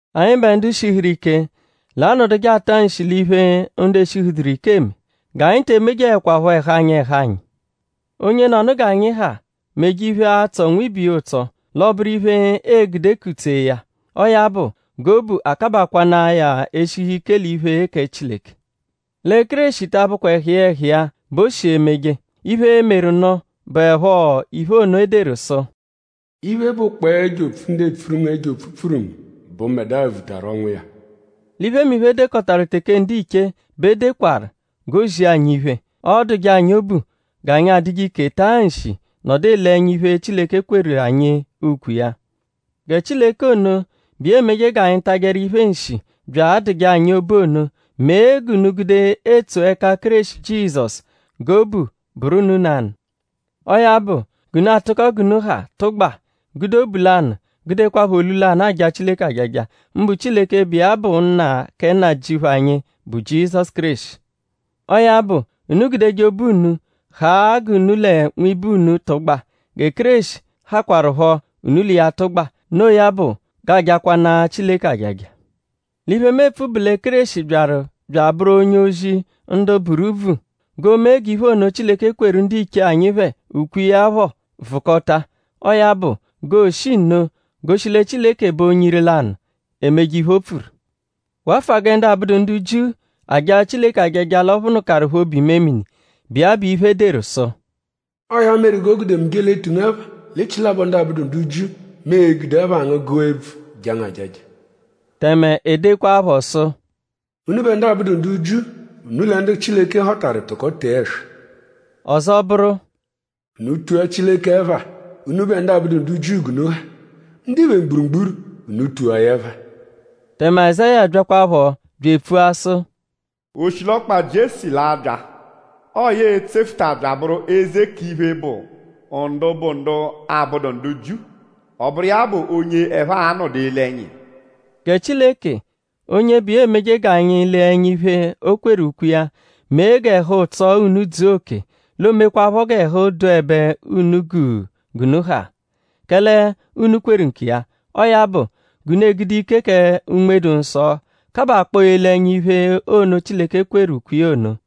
Anyịbe ndu shihuru ike; l'a-nọduje ata nshi l'iphe, ndu eshihuduru ike eme. G'anyi te emejeẹkwapho ẹhu anyi ẹhu anyi. Onyenọnu g'anyi ha meje iphe, a-tsọ nwibe iya ụtso; l'ọ bụru iphe, ee-gude kutsee ya. Ọo ya bụ; g'obu akabakwanaa ya eshihu ike l'iphe, kẹ Chileke. Lẹ Kéreshi ta abụkwa ẹhu iya ẹhu iya bẹ o shi emeje. Iphe, meru nụ bụepho iphe ono, e deru sụ: “Iphe, bụkpoo ẹjo-opfu, ndu epfuru ngu ẹjo-opfu pfuru ngu bụ mbẹdua vutaru ọnwu iya.” L'iphemiphe, e dekọtaru teke ndiche bẹ e dekwaru g'o zia anyi iphe. Ọoduje anyi obu g'anyi adụje ike taa nshi nọdu ele ẹnya iphe, Chileke kweru anyi ukwe iya. Gẹ Chileke ono, bụ iya emeje g'anyi tajẹru iphe nshi; bya adụje anyi obu ono mee g'unu gude etso ẹka Kéreshi Jizọsu g'obu bụru unu nanụ. Ọo ya bụ; g'unu atụko g'unu ha tụgba; gude obu lanụ; gudekwaphọ olu lanụ aja Chileke ajaja; mbụ Chileke, bụ iya bụ Nna kẹ Nnajịuphu anyi, bụ Jizọsu Kéreshi. Ọo ya bụ; unu gudeje obu unu haa g'unu lẹ nwibe unu tụgba; gẹ Kéreshi hakwarụpho; unu l'iya tụgba; noo ya bụ g'aa-jakwanaa Chileke ajaja. L'iphe, mu epfu bụ lẹ Kéreshi byaru bya abụru onye-ozi ndu buru úbvù; g'o mee g'iphe ono, Chileke kweru ndiche anyi phẹ ukwe iya phọ vụkota. Ọo ya bụ; g'oo-shi nno goshi lẹ Chileke bụ onye ire-lanụ, emeje iphe, o pfuru. Wafụa gẹ ndu abụdu ndu Jiu ajaa Chileke ajaja l'ọ phụnukaru phẹ obu-imemini, bụ iya bụ iphe, e deru sụ: “Ọo ya meru g'o gude mu je l'etu ngu ẹpha l'echilabọ ndu abụdu ndu Jiu. Mu e-gude ẹpha ngu gụa ebvu jaa ngu ajaja.” Tẹme e dekwaaphọ sụ: “Unubẹ ndu abụdu ndu Jiu; unu lẹ ndu Chileke họtaru tụko tee ẹswa!” Ọzo bụru: “Unu tua Chileke ẹpha; unubẹ ndu abụdu ndu Jiu g'unu ha. Ndiphe mgburugburu; unu tua ya ẹpha!” Tẹme Azáya byakwaphọ bya epfua sụ: “Oshilọkpa Jiesi l'a-bya! Ọo ya e-tsefuta bya abụru eze k'iphe, bụ ndu bụ ndu abụdu ndu Jiu. Ọ bụru iya bụ onye ẹphe a-nọdu ele ẹnya iya.” Gẹ Chileke, onye bụ iya emeje g'anyi lee ẹnya iphe, o kweru ukwe iya; mee g'ẹhu-ụtso unu dzua oke; l'oomekwaaphọ g'ẹhu dụebe unu guu g'unu ha; kẹle unu kweru nkiya. Ọo ya bụ; g'unu egude ike kẹ Unme-dụ-Nsọ kabakpọo ele ẹnya iphe ono, Chileke kweru ukwe iya ono.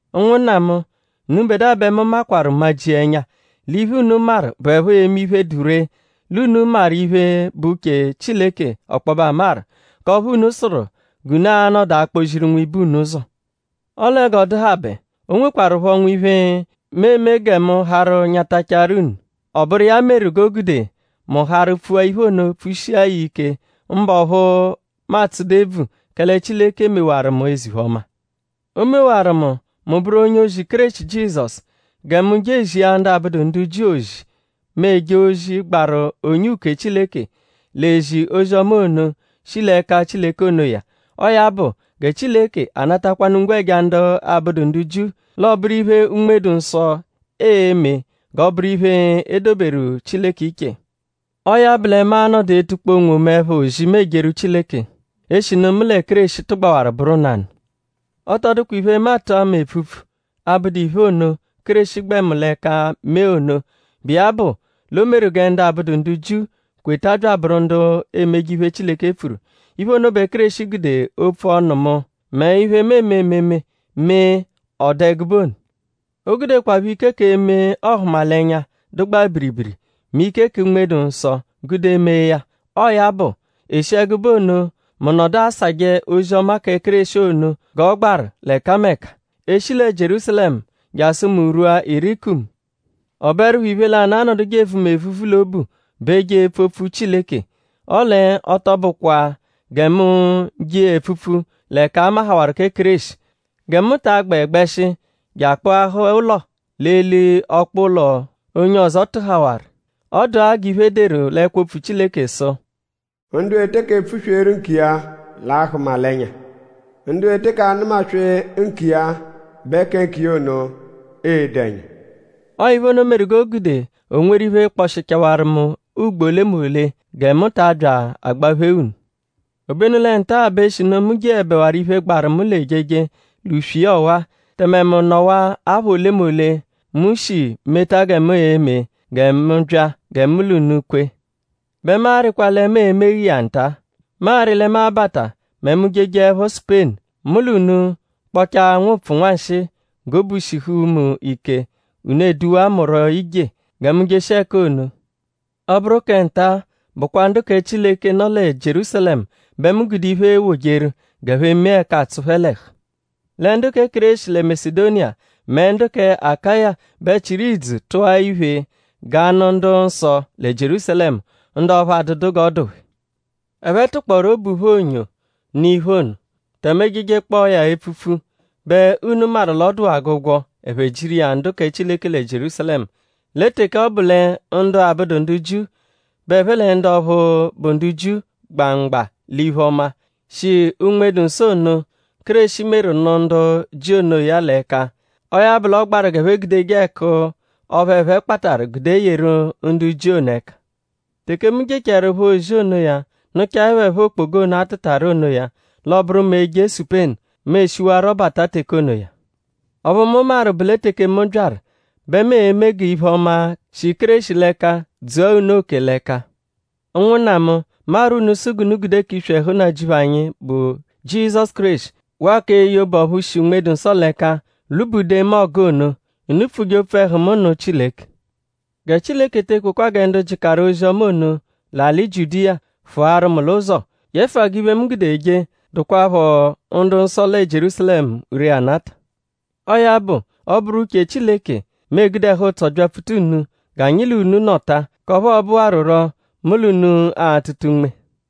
Ụnwunna mu; unubẹdua bẹ mu maakwaru majia ẹnya; l'iphe, unu maru bụepho eme iphe, dụ ree; l'unu maru iphe, bụ uche Chileke ọkpobe amaru; k'ọphu unu sụru g'unu a-nọdu akpọ-ziru nwibe unu ụzo. Ọle g'ọ dụhabe; o nwekwarụpho nwiphe, mu eme gẹ mu harụ nyatachaarụ unu; ọ bụru iya meru g'o gude mu harụ pfua iphe ono pfushia ya ike; mbụ ọphu mu atsụdu ebvu; kẹle Chileke mewaru mu eze-iphe-ọma. O mewaru mu; mu bụru onye-ozi Kéreshi Jizọsu; gẹ mu je ezia ndu abụdu ndu Jiu ozi; mu eje ozi, gbaru onye uke Chileke l'ezi ozi-ọma ono, shi l'ẹka Chileke onoya. Ọo ya bụ gẹ Chileke anatakwanu ngwẹja ndu abụdu ndu Jiu. L'ọ bụru iphe, Unme-dụ-Nsọ e-me g'ọ bụru iphe, e doberu Chileke iche. Ọo ya bụ lẹ mu a-nọdu etukpọ onwomu ẹpha ozi, mu ejeru Chileke; eshinu mu lẹ Kéreshi tụgbawaru bụru nanụ. Ọ tọ dụkwa iphe, mu atụ ama epfupfu, abụdu iphe ono, Kéreshi gbẹ mu l'ẹka mee ono, bụ iya bụ l'o meru gẹ ndu abụdu ndu Jiu kweta bya abụru ndu emeje iphe, Chileke pfuru. Iphe ono bẹ Kéreshi gude opfu ọnu mu; mẹ iphe, mu eme ememe; mee ọ dụ ẹgube ono. O gudekwaphọ ike k'eme ọhumalenya, dụgbaa biribiri; mẹ ike kẹ Unme-dụ-Nsọ gude mee ya. Ọo ya bụ; e shi ẹgube ono mu nọdu asajẹ ozi-ọma kẹ Kéreshi ono g'ọ gbaru l'ẹkameka; e -shi lẹ Jierúsalẹmu jasụ mu rwua Ilirikumu. Ọ bụerupho iphe lanụ, anọduje evu mu evuvu l'obu bụ eje epfu opfu Chileke; ọle ọ tọ bụkwa gẹ mu je iya epfupfu l'ẹka a mahawarụ kẹ Kéreshi; gẹ mu ta agbẹ gbẹshi je akpụahaa ụlo l'eli ọkpa ụlo, onye ọzo tụhawaru. Ọ dụa g'iphe, e deru l'ẹkwo-opfu Chileke sụ: “Ndu e teke pfusweeru nkiya l'a-hụma l'ẹnya. Ndu e teke anụma-swee nkiya bẹ kẹ nkiya ono e-do ẹnya.” Ọo iphe ono meru g'o gude o nweru iphe, kpọshichawaru mu ugbo olemole gẹ mu ta abya agbaphee unu. Obenu lẹ nta-a bẹ eshinu mu jeẹbewaru iphe, gbaru mu l'ejeje l'uswe iya ọwa; tẹme mu nọwaa apha olemole, mu shi meta gẹ mu e-me gẹ mu bya gẹ mu l'unu kwee; bẹ mu arịkwa lẹ mu e-megha iya nta. Mu arị lẹ mu a-bata mẹ mu -jejeẹpho Supenu. Mu l'unu kpọchaa nwụpfu nwanshịi g'obu shihu mu ike; unu eduwa mu rọ ije; gẹ mu jeshia ẹka ono. Ọ -bụru kẹ nta-a bụkwa ndu kẹ Chileke nọ lẹ Jierúsalẹmu bẹ mu gude iphe ewojeru g'ẹphe mee ẹka atsụ phẹ l'ẹhu. Lẹ ndu kẹ Kéreshi lẹ Masedoniya; mẹ ndu kẹ Akaya bẹ chịru idzu; tụa iphe g'a nụ ndu-nsọ lẹ Jierúsalẹmu; ndu ọphu adụdu g'ọ dụ phẹ. Ẹphe tụkpooru obu phẹ onyo nụ iphe ono. Tẹme e -jejekpọo ya epfupfu bẹ unu maru l'ọ dụwaa g'ụgwo; ẹphe jiru iya ndu kẹ Chileke lẹ Jierúsalẹmu; lẹ teke ọ bụ lẹ ndu abụdu ndu Jiu bẹ ẹphe lẹ ndu ọphu bụ ndu Jiu gba mgba l'iphe-ọma, shi Unme-dụ-Nsọ ono, Kéreshi meru nụ ndu Jiu onoya l'ẹka; ọo ya bụ l'ọ gbaru g'ẹphe gudeje ẹku ọphu ẹphe kpatarụ gude yeru ndu Jiu ono ẹka. Teke mu jechaẹrupho ozi onoya; nụchae phẹ phọ okpoga ono, a tụtaru onoya l'ọo-bụru mu eje Supenu; mu e-shiwarọ bata teke onoya. Ọphu mu maru bụ lẹ teke mu byaru bẹ mu e-me g'iphe-ọma, shi Kéreshi l'ẹka dzua unu oke l'ẹka. Ụnwunna mu; mu arwọ unu sụ g'unu gude k'iswi ẹhu Nnajịuphu anyi, bụ Jizọsu Kéreshi waa k'eye obu ọphu shi Unme-dụ-Nsọ l'ẹka lwubude mu ọgu ono. Unu pfuje opfu ẹhu mu nụ Chileke. Gẹ Chileke te ekwekwa gẹ ndu jịkaru ozi-ọma ono l'alị Jiudiya fụaru mu l'ụzo; yẹfua g'iphe, mu gude eje dụkwapho ndu-nsọ lẹ Jierúsalẹmu ree anata. Ọo ya bụ; ọ -bụru uche Chileke; mu egude ẹhu-ụtso byapfuta unu g'anyi l'unu nọta; k'ọphu ọo-bụwaruro mu l'unu atụta unme.